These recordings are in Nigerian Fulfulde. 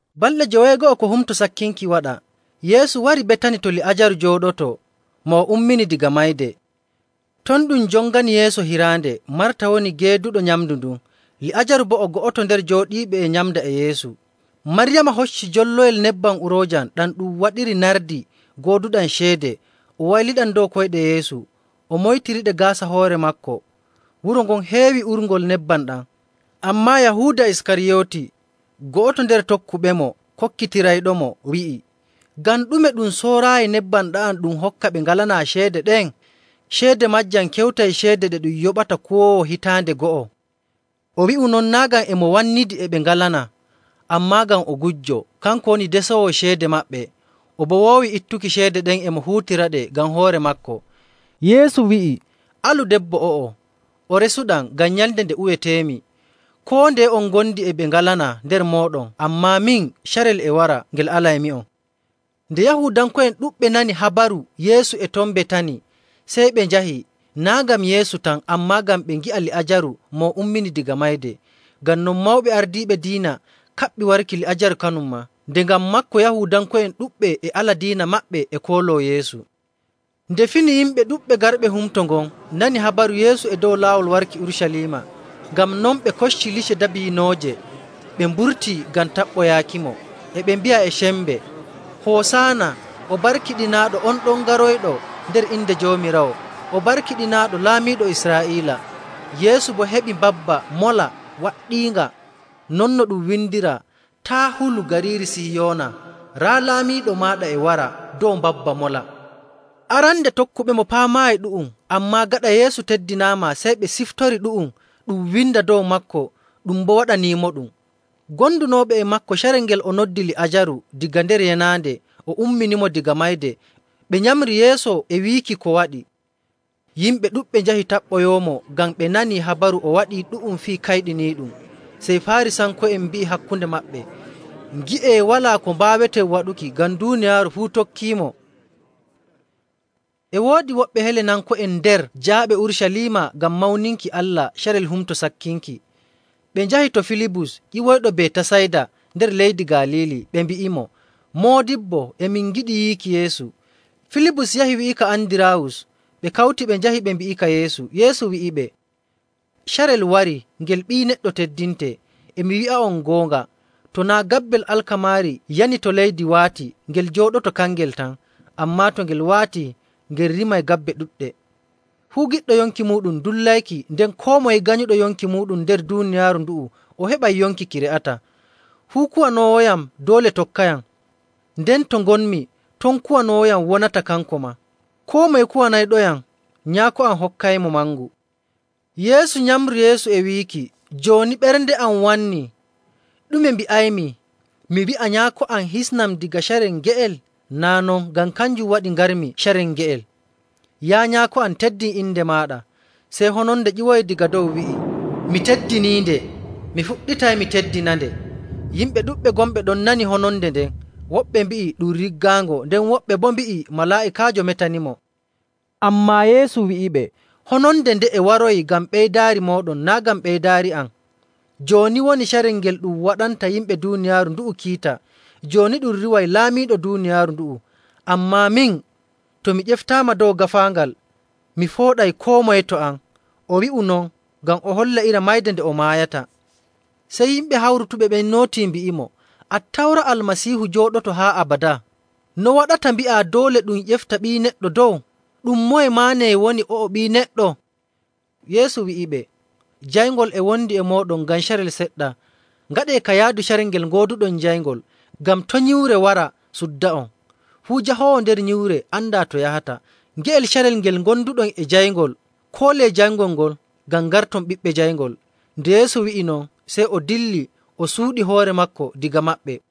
Balɗe joweego'o ko Humto Sakkinki waɗa, Yeesu wari Betani to Li'aajaru jooɗotoo, mo o ummini daga mayde. Ton ɗum jongani Yeesu hiraande. Marta woni geeduɗo nyamndu ndun. Li'aajaru boo o go'oto nder jooɗiiɓe e nyamnda e Yeesu. Maryaama hocci jolloyel nebbam uroojam ɗam ɗum waɗiri nardi gooduɗam ceede, o wayliɗam dow koyɗe Yeesu, o moytiriɗe gaasa hoore maako. Wuro ngon heewi urngol nebbam ɗam.. Ammaa Yahuuda Iskariyooti, go'oto nder tokkuɓemo, kokkitirayɗomo, wi'i, “Ngam ɗume ɗum sooraayi nebbam ɗa'am ɗum hokka ɓe ngalanaa ceede ɗen? Ceede maajam kewtay ceede ɗe ɗum yoɓata kuwoowo hitaande go'o.” O wi'u non naa' ngam e mo wannidi e ɓe ngalanaa, ammaa ngam o gujjo. Kanko woni desoowo ceede maɓɓe, o boo woowi ittuki ceede ɗen e mo huutiraɗe ngam hoore maako. Yeesu wi'i, “Alu debbo o'o. O resuɗam ngam nyalnde nde uweteemi. Koo ndeye on ngondi e ɓe ngalanaa nder mooɗon, ammaa min, carel e wara ngel alaymi'on.”. Nde Yahuudanko'en ɗuɗɓe nani habaru Yeesu e ton Betani, sey ɓe njahi, naa' ngam Yeesu tan, ammaa ngam ɓe ngi'a Li'aajaru, mo o ummini daga mayde. Ngam non, mawɓe ardiiɓe diina kaɓɓi warki Li'aajaru kanum maa, nde ngam maako Yahuudanko'en ɗuɗɓe e ala diina maɓɓe e kooloo Yeesu. Nde fini, yimɓe ɗuɗɓe garɓe humto ngon nani habaru Yeesu e dow laawol warki Urucaliima. Ngam non ɓe kocci lice dabiinooje ɓe mburtii ngam taɓɓoyaakimo, e ɓe mbi'a e sembe, “Hosaana! O barkiɗinaaɗo on ɗon garoyɗo nder inde Joomiraawo. O barkiɗinaaɗo Laamiiɗo Israa'iila!” Yeesu boo heɓi mbabba mola waɗɗiinga, non no ɗum windiraa, “Taa' hulu, gariiri Sihiyoona. Raa laamiiɗo maaɗa e wara dow mbabba mola.”. Arande tokkuɓemo paamaayi ɗu'um, ammaa gaɗa Yeesu teddinaama, sey ɓe ciftori ɗu'um ɗum windaa dow maako ɗum boo waɗaniimoɗum. Gondunooɓe e maako carel ngel o noddi Li'aajaru daga nder yenaande o umminimo daga mayde, ɓe nyamri yeeso e wiiki ko waɗi. Yimɓe ɗuɗɓe njahi taɓɓoyoomo ngam ɓe nanii habaru o waɗii ɗu'um fii kayɗiniiɗum. Sey Faarisanko'en mbi'i hakkunde maɓɓe, “Ngi'ee, walaa ko mbaaweten waɗuki, ngam duuniyaaru fuu tokkiimo.” E woodi woɓɓe Helenanko'en nder jaaɓe Urucaliima ngam mawninki Allah carel Humto Sakkinki. Ɓe njahi to Filibus ƴiwoyɗo Betasayda nder leydi Galiili, ɓe mbi'imo, “Moodibbo, e min ngiɗi yiiki Yeesu.” Filibus yahi wi'ika Andiraawus ɓe kawti ɓe njahi ɓe mbi'ika Yeesu. Yeesu wi'iɓe, “Carel warii ngel Ɓii Neɗɗo teddintee. E mi wi'a'on goonga, to naa' gabbel alkamaari yani to leydi waati, ngel jooɗoto kangel tan. Ammaa to ngel waatii, ngel rimay gabbe ɗuɗɗe. Fuu giɗɗo yonki muuɗum dullayki, nden koo moye ganyuɗo yonki muuɗum nder duuniyaaru ndu'u o heɓay yonki ki re'ataa.. Fuu kuwanoowoyam doole tokkayam. Nden to ngonmi, ton kuwanoowoyam wonata, kanko maa. Koo moye kuwanayɗoyam, Nyaako am hokkaymo mangu.” Yeesu nyamri yeeso e wiiki, “Jooni ɓernde am wannii. Ɗume mbi'aymi? Mi wi'a, ‘Nyaako am, hisnam daga carel nge'el?’ Naa' non, ngam kanjum waɗi ngarmi carel nge'el. Yaa Nyaako am, teddin inde maaɗa!” Sey hononde ƴiwoyi daga dow wi'i, “Mi teddiniinde, mi fuɗɗitay mi teddinande.” Yimɓe ɗuɗɓe gonɓe ɗon nanii hononde nden. Woɓɓe mbi'i ɗum riggaango: Waato falmaango., nden woɓɓe boo mbi'i, “Malaa'ikaajo metanimo.” Ammaa Yeesu wi'iɓe, “Hononde nde'e waroyi ngam ɓeydaari mooɗon, naa' ngam ɓeydaari am. Jooni woni carel ngel ɗum waɗanta yimɓe duuniyaaru ndu'u kiita. Jooni ɗum riiway laamiiɗo duuniyaaru ndu'u. Ammaa min, to mi ƴeftaama dow gaafaangal, mi fooɗay koo moye to am.” O wi'u non ngam o holla iri mayde nde o maayata. Sey yimɓe hawrutuɓe ɓen nootii mbi'imo, “Attawra Almasiihu jooɗoto haa abadaa. No waɗata mbi'aa doole ɗum ƴefta Ɓii Neɗɗo dow? Ɗum moye maa nee woni o'o Ɓii Neɗɗo?”. Yeesu wi'iɓe, “Jayngol e wondi e mooɗon ngam carel seɗɗa. Ngaɗee ka yaadu carel ngel gooduɗon jayngol, ngam to' nyiwre wara sudda'on. Fuu jahoowo nder nyiwre andaa to yahata. Nge'el carel ngel ngonduɗon e jayngol, koolee jayngol ngol, ngam ngarton ɓiɓɓe jayngol.” Nde Yeesu wi'i non, sey o dilli o suuɗi hoore maako daga maɓɓe.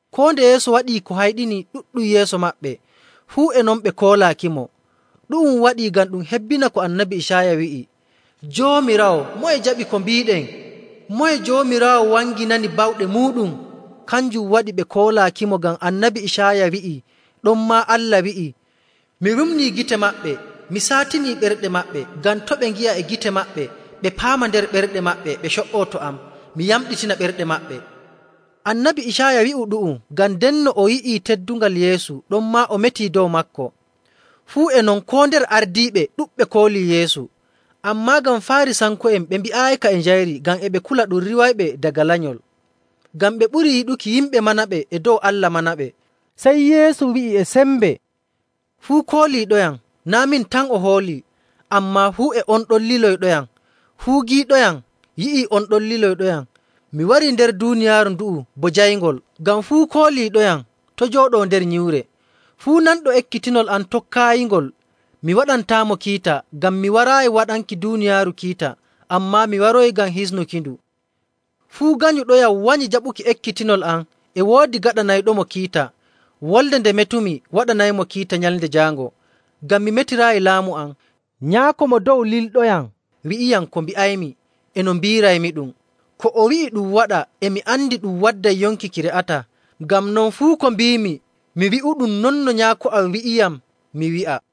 Koo nde Yeesu waɗii ko hayɗini ɗuɗɗum yeeso maɓɓe, fuu e non ɓe koolaakimo. Ɗu'um waɗi ngam ɗum hebbina ko Annabi Icaaya wi'i,. “Joomiraawo, moye jaɓi ko mbiiɗen? Moye Joomiraawo wanginani bawɗe muuɗum?” Kanjum waɗi ɓe koolaakimo, ngam Annabi Icaaya wi'i ɗonmaa Allah wi'i, “Mi wumnii gite maɓɓe mi saatinii ɓerɗe maɓɓe, ngam to' ɓe ngi'a e gite maɓɓe, ɓe paama nder ɓerɗe maɓɓe, ɓe co''oo to am, mi yamɗitina ɓerɗe maɓɓe.”. Annabi Icaaya wi'u ɗu'um ngam ndenno o yi'ii teddungal Yeesu, ɗonmaa o metii dow maako. Fuu e non, koo nder ardiiɓe, ɗuɗɓe koolii Yeesu. Ammaa ngam Faarisanko'en ɓe mbi'aayika e njayri ngam e ɓe kula ɗum riiwaɓe daga lenyol. Ngam ɓe ɓurii yiɗuki yimɓe manaɓe e dow Allah manaɓe. Sey Yeesu wi'i e sembe, “Fuu kooliiɗoyam, naa' min tan o hoolii, ammaa fuu e on ɗon liloyɗoyam. Fuu giiɗoyam yi'i on ɗon liloyɗoyam. Mi warii nder duuniyaaru ndu'u bo jayngol, ngam fuu kooliiɗoyam to' jooɗoo nder nyiwre. Fuu nanɗo ekkitinol am tokkaayingol, mi waɗantaamo kiita, ngam mi waraayi waɗanki duuniyaaru kiita, ammaa mi waroyi ngam hisnukindu. Fuu ganyuɗoyam wanyi jaɓuki ekkitinol am, e woodi gaɗanayɗomo kiita. Wolde nde metumi waɗanaymo kiita Nyalnde Jaango. Ngam mi metiraayi laamu am, Nyaako Mo Dow lilɗoyam wi'iyam ko mbi'aymi e no mbi'iraymiɗum. Ko o wi'i ɗum waɗa, e mi andi ɗum wadday yonki ki re'ataa. Ngam non, fuu ko mbiimi mi wi'uɗum non no Nyaako am wi'iyam mi wi'a.”